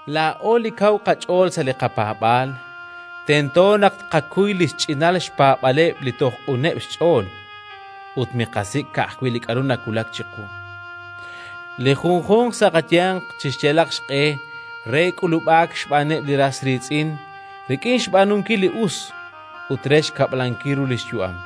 Laa'o li kaw qach'ool sa' li qapaab'aal tento naq tqakuy li xch'inal xpaab'aaleb' li toj q'uneb' xch'ool, ut miqasik' ka'ajwi' li k'aru nawulak chiqu. Li junjunq sa' qayanq chixyalaq xq'e re k'ulub'aak xb'aaneb' li ras riitz'in rik'in xb'aanunkil li us ut re xkab'lankil ru li xyu'am.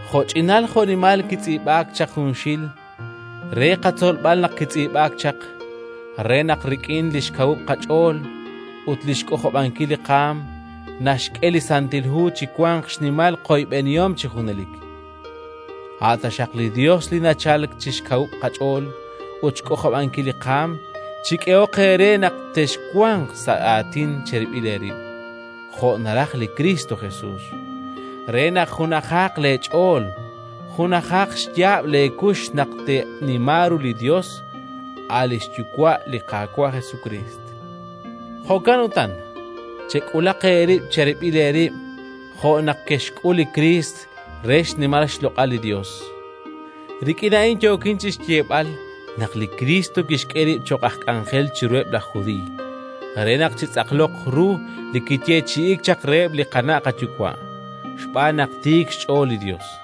Jo'ch'inal jo'nimal kitz'iib'aak chaq junxil, re qatzolb'al naq kitz'iib'aak chaq, re naq rik'in li xkawub' qach'ool ut li xk'ojob'ankil li qaanm naxk'e li Santil Hu chiwanq xnimal qoyb'enihom chi junelik. A' taxaq li Yos li nachalk wi' xkawub' qach'ool ut xk'ojob'ankil li qaanm chik'ehoq eere naq texwanq sa' aatin cherib'il eerib', jo' naraj li Kristo Jesus, re naq junajaq leech'ool junajaq xyaab' leekux naq teenima ru li Yos, a' li xYuwa' li Qaawa' Jesukriist. Jo'kan utan, chek'ulaq eerib' cherib'il eerib' jo' naq kexxk'ul li Kriist re xnimal xloq'al li Yos. Rik'in a'in yookin chi xyeeb'al naq li Kriist kixk'e rib' cho'q aj k'anjel chiruheb' laj Judiiy, re naq chitz'aqloq ru li kiyeechi'iik chaq reheb' li qana' qayuwa', xb'aan naq tiik xch'ool li Yos.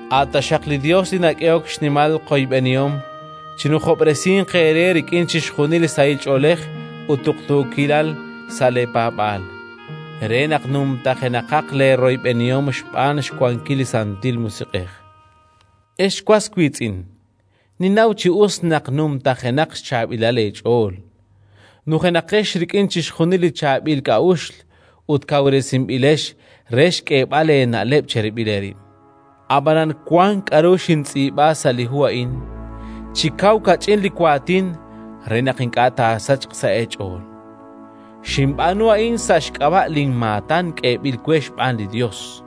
A' taxaq li Yos li nak'ehok xnimal qoyb'enihom chinujob'resinq eere rik'in chixjunil li sahil ch'oolej ut tuqtuukilal sa' leepaab'aal, re naq numtajenaqaq leeroyb'enihom xb'aan xwankil li Santil Musiq'ej. Ex was wiitz'in, ninnaw chi us naq numtajenaq xchaab'ilal eech'ool, nujenaqex rik'in chixjunil li chaab'il k'a'uxl ut kawresinb'ilex re xk'eeb'al eena'leb' cherib'il eerib'. Ab'anan wank k'aru xintz'iib'a sa' li hu a'in, chi kaw kach'in li waatin, re naq ink'a' taasachq sa' eech'ool. Xinb'aanu a'in sa' xk'ab'a' linmaatan k'eeb'il we xb'aan li Yos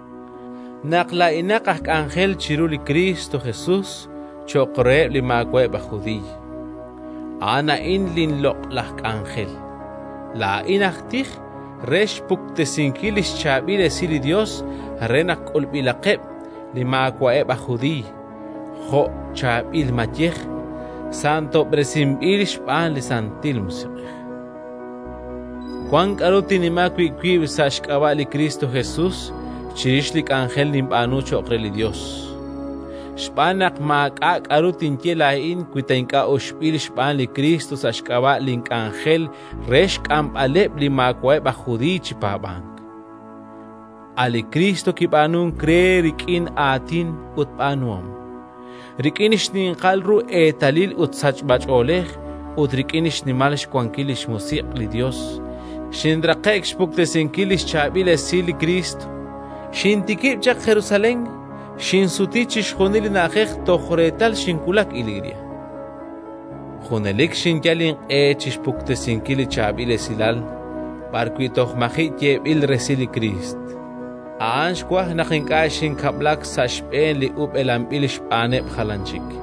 naq laa'inaq aj k'anjel chiru li Kristo Jesus cho'q reheb' li maawa'eb' aj Judiiy. A'an a'in linloq'laj k'anjel: laa'in aj tij re xpuktesinkil li xChaab'il Esil li Yos re naq k'ulb'ilaqeb' li maawa'eb' aj Judiiy jo' chaab'il mayej, santob'resinb'il xb'aan li Santil Musiq'ej. Wank k'aru tinnima wi' wib' sa' xk'ab'a' li Kristo Jesus chirix li k'anjel ninb'aanu cho'q re li Yos. Xb'aan naq maak'a' k'aru tinye laa'in wi ta ink'a' uxb'il xb'aan li Kriist sa' xk'ab'a' link'anjel re xk'amb'aleb' li maawa'eb' aj Judiiy chi paab'ank. A' li Kriist kib'aanunk re rik'in aatin ut b'aanuhom, rik'in xninqal ru eetalil ut sachb'ach'oolej ut rik'in xnimal xwankil li xMusiq' li Yos. Xinraqe'k xpuktesinkil li xChaab'il Esil li Kriist: xintikib' chaq Jerusalén, xinsuti chixjunil li na'ajej toj reetal xinwulak Iliria. Junelik xinyal inq'e chi xpuktesinkil li Chaab'il Esilal b'arwi' toj maji' yeeb'il resil li Kriist; a'an xwaj naq ink'a' xinkab'lak sa' xb'een li ub'elanb'il xb'aaneb' jalan chik,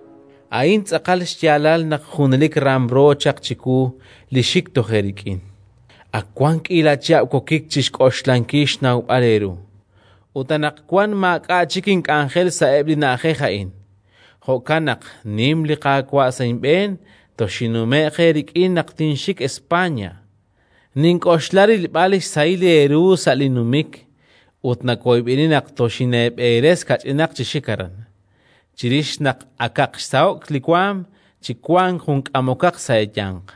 A'in tz'aqal xyaalal naq junelik ramro chaq chiwu li xik toj eerik'in. Ak wank k'iila chihab' wokik chi xk'oxlankil xnawb'al eeru. Ut anaqwan maak'a' chik ink'anjel sa'eb' li na'ajej a'in. Jo'kan naq, nim li Qaawa' sa' inb'een, toxinnume'q eerik'in naq tinxik España. Nink'oxla rilb'al xsahil eeru sa' linnumik; ut nawoyb'eni naq toxineeberes kach'inaq chi xik aran, chirix naq akaq xsaho'k li waanm chi wank jun k'amokaq sa' eeyanq.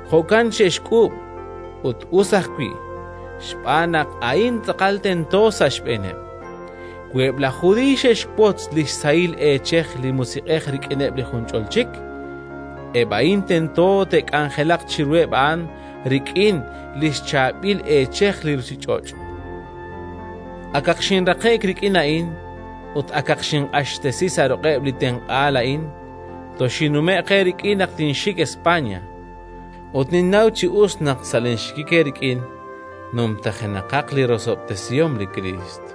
Jo'kan xe'xk'uub', ut us ajwi', xb'aan naq a'in tz'aqal tento sa' xb'eeneb': wi eb' laj Judiiy xe'xwotz li xsahil eechej li Musiq'ej rik'ineb' li junch'ol chik, eb' a'in tento te'k'anjelaq chiruheb' a'an rik'in li xchaab'il eechej li ruuchich'och'. Akaq xinraqe'k rik'in a'in ut akaq xinq'axtesi sa' ruq'eb' li tenq'aal a'in, toxinnume'q eerik'in naq tinxik España. Ut ninnaw chi us naq, sa' linxikik eerik'in, numtajenaqaq li rosob'tesihom li Kriist.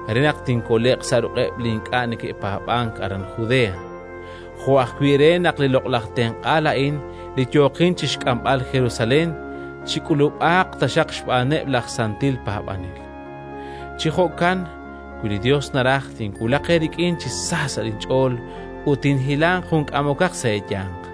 re naq tinkole'q sa' ruq'eb' li ink'a' neke'paab'ank aran Judea, jo' ajwi' re naq li loq'laj tenq'aal a'in li yookin chi xk'amb'al Jerusalén chik'ulub'aaq taxaq xb'aaneb' laj santil paab'anel. Chi jo'kan, wi li Yos naraj, tinwulaq eerik'in chi sa sa' inch'ool ut tinhilanq jun k'amokaq sa' eeyanq.